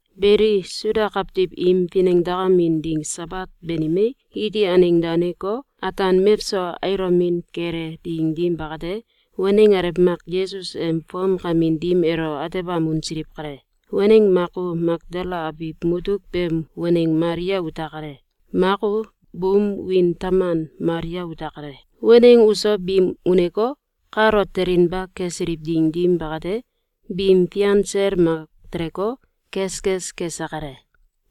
Beli, Suda kawtiw im finengdakamin ding Sabat banimei, iti aneng daneko, ataan mewso ailomin kele ding dim bakate, waneng alew mak Yesus em fomkamin dim elo atebam unsiliw kale. Waneng mak u Makdala abiw mutuk beem waneng Malia ute kale. Mak u buum wiin taman Malia ute kale. Waneng uso biim uneko, kalo telinba kesiliw ding dim bakate, bim fian sel mak teleko, keskes kese kale.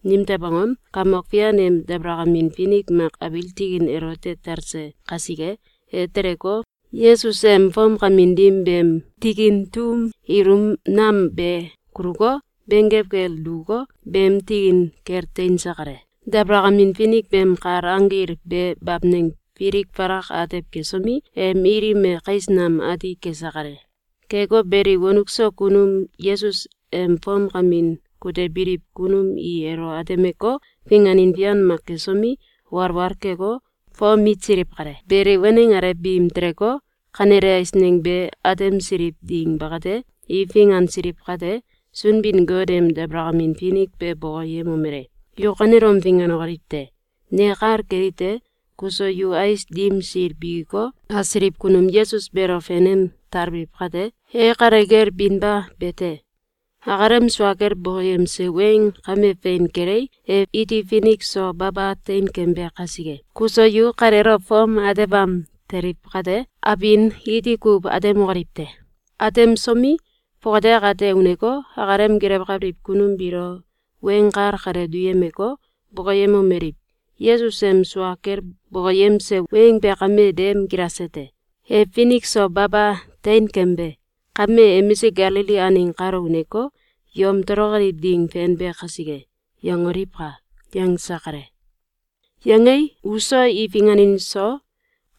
Nimtew angom? Kamok Fian em dabalakamin finik mak abiil tikin elote talse kasike. E teleko, Yesus em fomkamin dim beem tikin tum ilum nam be kuluko, benggew kel dukuko, beem tikin kel teinse kale. Dabalakamin finik beem kal anggil be bamneng filik falak atew kesomi, em ilim e kais nam ati kese kale. Keko beli, wonuk so kunum Yesus em fomkamin kutebiliw kunum i elo atemeko, finganin fian mak kesomi, walwal keko, fom mitsiliw kale. Beli, waneng alew biim teleko, kanele eisneng be atemsiliw ding bakate, i fingansiliw kate, Sunbin-Got em dabalakamin finik be bokoyemomele: “Yu kanelom finganokoliw te! Ne kal kelite: Kuso yu ais dim sil bikiko, asiliw kunum Yesus beelo fenem talbiliw kate, e kale kel binba be te. Akalem sua kel bokoyemse weng kame fein kelei, e iti finik so baba teinkembe kasike. Kuso yu kaleelo fom atebam teliw kate, abin iti kuw atemokoliw te. Atemsomi, fongate akate uneko, akalem gelewkabiliw kunum biilo weng kal kale duyemeko, bokoyemomeliw: ‘Yesus em sua kel bokoyemse weng be kame dem gilase te. E finik so baba teinkembe! Kame emisik Galili aneng kalo uneko, yom tolokoliw ding fenbe kaiske!’, yangoliwka!”, yangse kale. Yangei, uso i finganin so,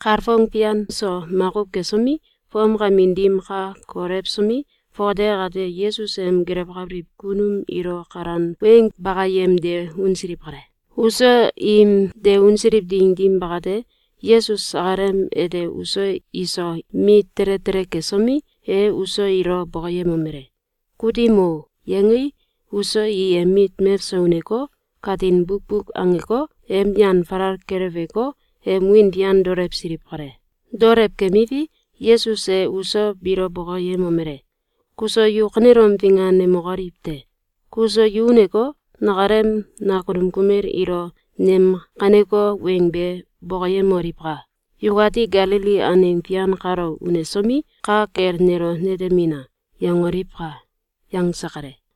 kalfong fian so makuw kesomi, fomkamin dim ka kolewsomi, fongate akate Yesus em gelewkabiliw kunum ilo kalan weng bakayem de unsiliw kale. Uso im de unsiliw ding dim bakate, Yesus akalem ete uso iso mit tele tele kesomi, e uso ilo bokoyemomele: “Kutim o!”, yangei, uso i em mit mewso uneko, katin bukbuk angeko, em yan falal keleweko, em wiin fian daolewsiliw kale. Daolew kemiwi, Yesus e uso biilo bokoyemomele: “Kuso yu kanelom finganemokoliw te! Kuso yu uneko, nakalem nakunum kumel ilo nem kaneko weng be bokoyemoliwka! ‘Yukati Galili aneng fian kalo unesomi, ka kel nelo netemina!’, yangoliwka!”, yangse kale.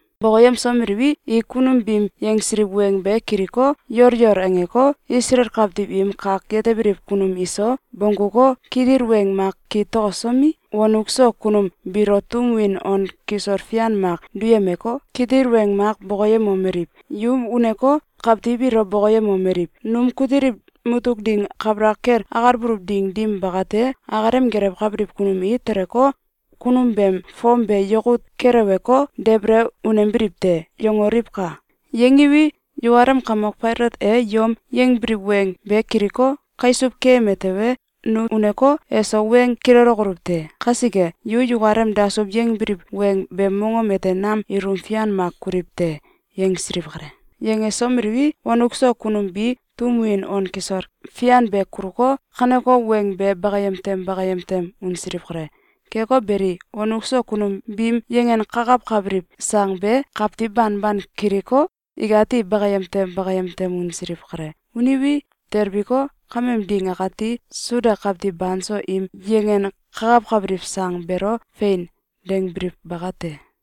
Bokoyemsomeliwi, i kunum biim yangsiliw weng be kiliko, yol yol angeko, Isalael kawtiw im kak yetebiliw kunum iso, bongguko, kitil weng mak kitokosomi, wonuk so kunum biilo tum win on kisol fian mak duyemeko, kitil weng mak bokoyemomeliw: “Yu uneko, kawtiw ilo bokoyemomeliw: ‘Num kutiliw mutuk ding kabalak kel akalbuluw ding dim bakate, akalem gelewkabiliw kunum i teleko, kunum beem fom be yakut keleweko, debele unembiliw te.’, yangoliwka! Yangiwi, yukalem kamok Failat e yom yangbiliw weng be kiliko, kaisuw keyeme tewe, nu uneko, eso weng kilelelokoluw te. Kasike, yu yukalem dasuw yangbiliw weng beem mongom ete nam ilum fian mak kuliw te!”, yangsiliw kale. Yangesomeliwi, wonuk so kunum bi tum win on kisol fian be kuluko, kaneko weng be bakayem tem bakayem tem unsiliw kale. Keko beli, wonuk so kunum biim yangankakawkabiliw sang be, kawtiw banban kiliko, ikati bakayem tem bakayem tem unsiliw kale. Uniwi, telbiko, kameem ding akati Suda kawtiw banso im yangenkakawkabiliw sang beelo “Fein!”, dangbiliw bakate.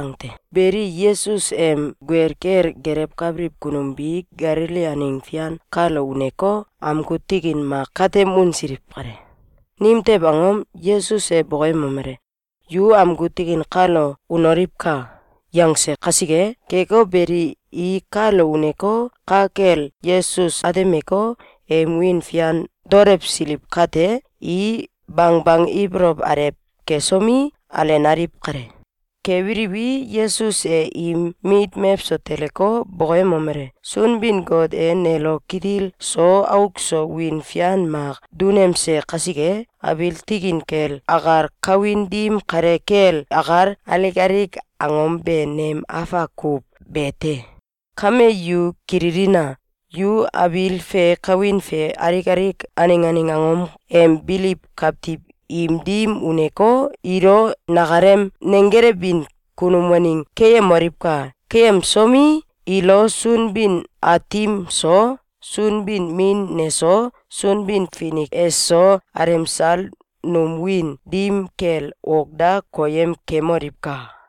Beli, Yesus em guel kel gelewkabiliw kunum bi Galili aneng fian kalo uneko, amgu tikin mak katem unsiliw kale. Nimtew angom? Yesus e bokoyemomele: “Yu amgu tikin kalo unoliwka!”, yangse kasike. Keko beli, i kalo uneko, ka kel Yesus atemeko, em wiin fian daolewsiliw kate, i bangbang ibolow alew kesomi, alenaliw kale. Kebiliwi, Yesus e im mit mewso teleko, bokoyemomele: “Sunbin-Got e nelo kitil so auk so wiin fian mak dunemse kasike, abiil tikin kel akal, kawin dim kale kel akal, alik alik angom be nem afak kuw be te. Kame yu kililina! Yu abiil fe kawin fe alik alik aneng aneng angom em biliw kawtiw im dim uneko, ilo nakalem nenggelewbin kunum waneng keyemoliwka! Keyemsomi, ilo Sunbin-Aatim so, Sunbin-Min neso, Sunbin-Finik eso, alemsal num wiin dim kel ok da koyem kemoliwka!